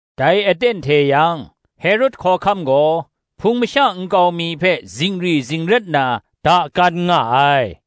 Dai aten hte yang, Herod hkawhkam gaw, Hpung masha nkau mi hpe zingri zingrat na dakan nga ai.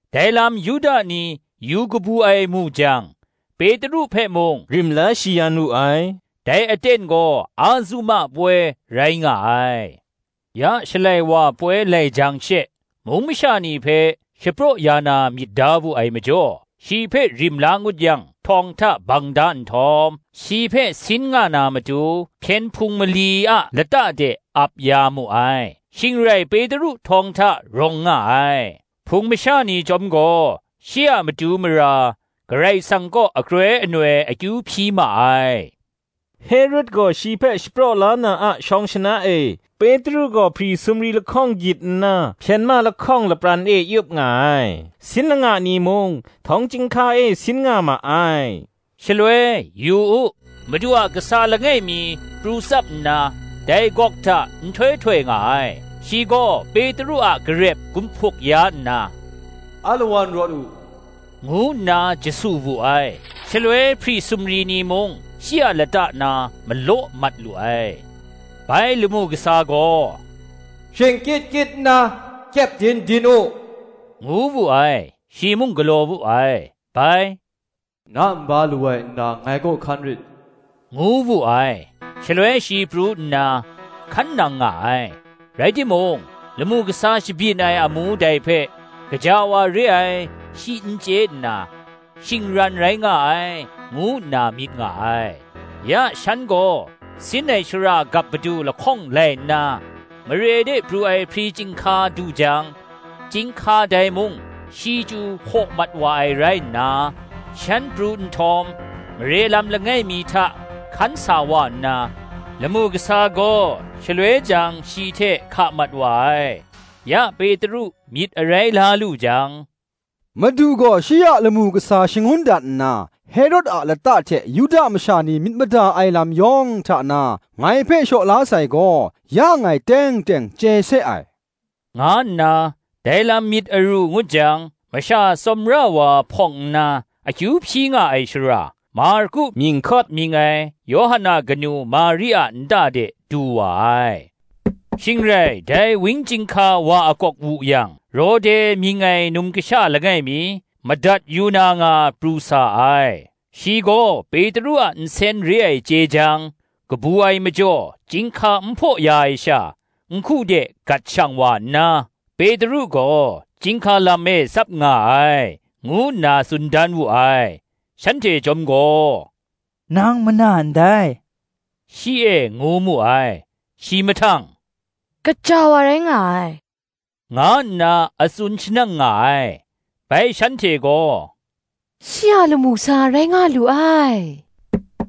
Dai lam Yuda ni yu kabu ai mu jang, Petru hpe mung rim la shayan wu ai. Dai aten gaw Azuma poi rai nga ai. Ya Shalai wa poi lai jang she, mung masha ni hpe shapraw ya na myit da wu ai majaw, shi hpe rim la ngut yang htawng hta bang da nhtawm, shi hpe sin nga na matu, hpyen hpung mali a lata de ap ya mu ai. Shing rai Petru htawng hta rawng nga ai; Hpung masha ni chyawm gaw shi a matu mara Karai Kasang kaw akroi anoi akyu hpyi ma ai. Herod gaw shi hpe shapraw la na a shawng shana e, Petru gaw hpri sumri lahkawng gyit nna, hpyen ma lahkawng lapran e yup nga ai: sin langa ni mung, htawng chyinghka e sin nga ma ai. Shaloi, yu u, Madu a kasa langai mi pru tsap nna, dai gawk hta nhtoi htoi nga ai: shi gaw Petru a garep gumhpuk ya nna, “Alawan rawt u,” ngu nna jasu wu ai; shaloi hpri sumri ni mung shi a lata na malaw mat lu ai. Bai lamu kasa gaw, “Shingkyit kyit nna, kyepdin din u,” ngu wu ai. Shi mung galaw wu ai. Bai, “Na nba lawai nna ngai kaw hkan rit,” ngu wu ai. Shaloi shi pru nna hkan nang nga ai; rai timung, lamu kasa shabyin ai amu dai hpe gaja wa re ai, shi n chye nna, shingran rai nga ai, ngu nna myit nga ai. Ya shan gaw sin ai shara gap padu lahkawng lai nna, mare de pru ai hpri chyinghka du jang, chyinghka dai mung shi chyu hpaw mat wa ai rai nna, shan pru nhtawm, mare lam langai mi hta hkan sa wa nna, lamu kasa gaw, shaloi jang shi hte hka mat wa ai. Ya Petru myit arai la lu jang, Madu gaw shi a lamu kasa shangun dat nna, Herod a lata hte Yuda masha ni myit mada ai lam yawng hta na ngai hpe shaw la sai gaw, ya ngai teng teng chye se ai, nga nna, dai lam myit aru ngut jang, masha tsawmra wa hpawng nna, akyu hpyi nga ai shara, Marku mying hkawt mying ai, Yawhan a kanu Mari a nta de du wa ai. Shing rai dai wang chyinghka wa akawk wu yang, Rode mying ai num kasha langai mi, madat yu na nga pru sa ai. Shi gaw Petru a nsen re ai chye jang, kabu ai majaw chyinghka n hpaw ya ai sha, nhku de gat shang wa nna, “Petru gaw chyinghka lam e tsap nga ai,” ngu nna tsun dan wu ai. Shanhte chyawm gaw, “Nang mana ndai,” shi e ngu mu ai. Shi mahtang, “gaja wa rai nga ai,” nga nna a tsun shanang nga ai. Bai shanhte gaw, “Shi a lamu kasa rai nga lu ai,”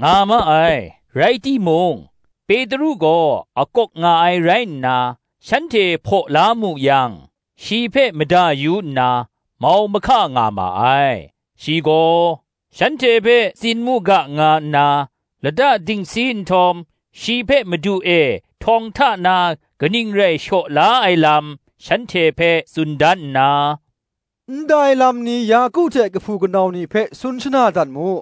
nga ma ai. Rai timung, Petru gaw a akawk nga ai rai nna, shanhte hpaw la mu yang, shi hpe mada yu nna, mau mahka nga ma ai. Shi gaw, shanhte hpe tsin mu ga nga nna, lata dingsi nhtawm, shi hpe Madu e htawng hta na kaning rai shaw la ai lam shanhte hpe tsun dan nna, “Ndai lam ni Yaku hte kahpu kanau ni hpe tsun shana dat mu,”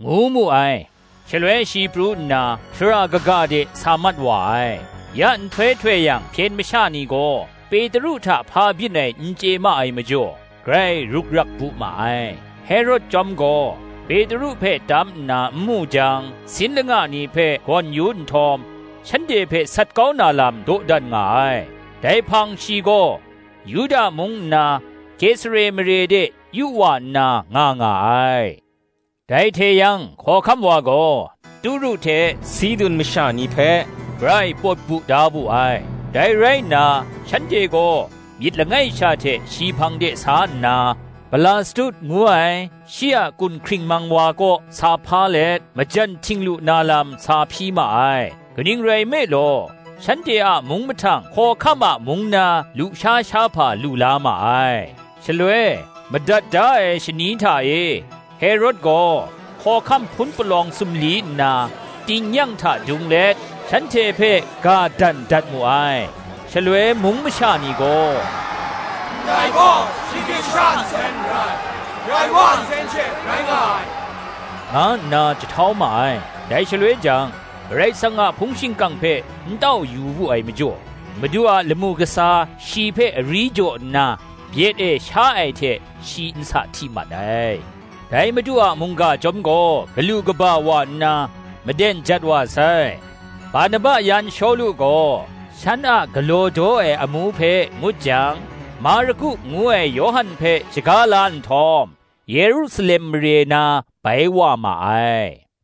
ngu mu ai. Shaloi shi pru nna, shara kaga de sa mat wa ai. Ya nhtoi htoi yang hpyen masha ni gaw, Petru hta hpa byin ai n chye ma ai majaw, grai ruk rak bu ma ai. Herod chyawm gaw Petru hpe tam nna nmu jang, sin langa ni hpe gawn yu nhtawm, shanhte hpe sat kau na lam dawdan nga ai. Herod Si Ai Lam Dai hpang shi gaw Yuda mung nna Kesare mare de yu wa nna nga nga ai. Dai hte yang hkawhkam wa gaw Turu hte Sidun masha ni hpe grai pawt bu da wu ai; dai rai nna, shanhte gaw myit langai sha hte shi hpang de sa nna, Blastu ngu ai, shi a kun hkringmang wa kaw sa hpa let, majan htinglu na lam sa hpyi ma ai: kaning rai nme law, shanhte a mung mahtang hkawhkam a mung na, lusha shahpa lu la ma ai. Shaloi, madat da ai shani hta e, Herod gaw hkawhkam hpun palawng sumli nna, tingnyang hta dung let, shanhte hpe ga dan dat mu ai. Shaloi mung masha ni gaw, “Ndai gaw shinggyim masha nsen n rai, Karai Wa a nsen she rai nga ai,” nga nna jahtau ma ai. Dai shaloi jang, Karai Kasang a hpung shingkang hpe n tau yu wu ai majaw, Madu a lamu kasa shi hpe ari jaw nna, byet e sha ai hte shi nsa hti mat ai. Dai Madu a mungga chyawm gaw galu kaba wa nna, maden jat wa sai. Barnaba yan Shawlu gaw, shan a galaw daw ai amu hpe ngut jang, Marku ngu ai Yawhan hpe shaga la nhtawm, Yerusalem mare na bai wa ma ai.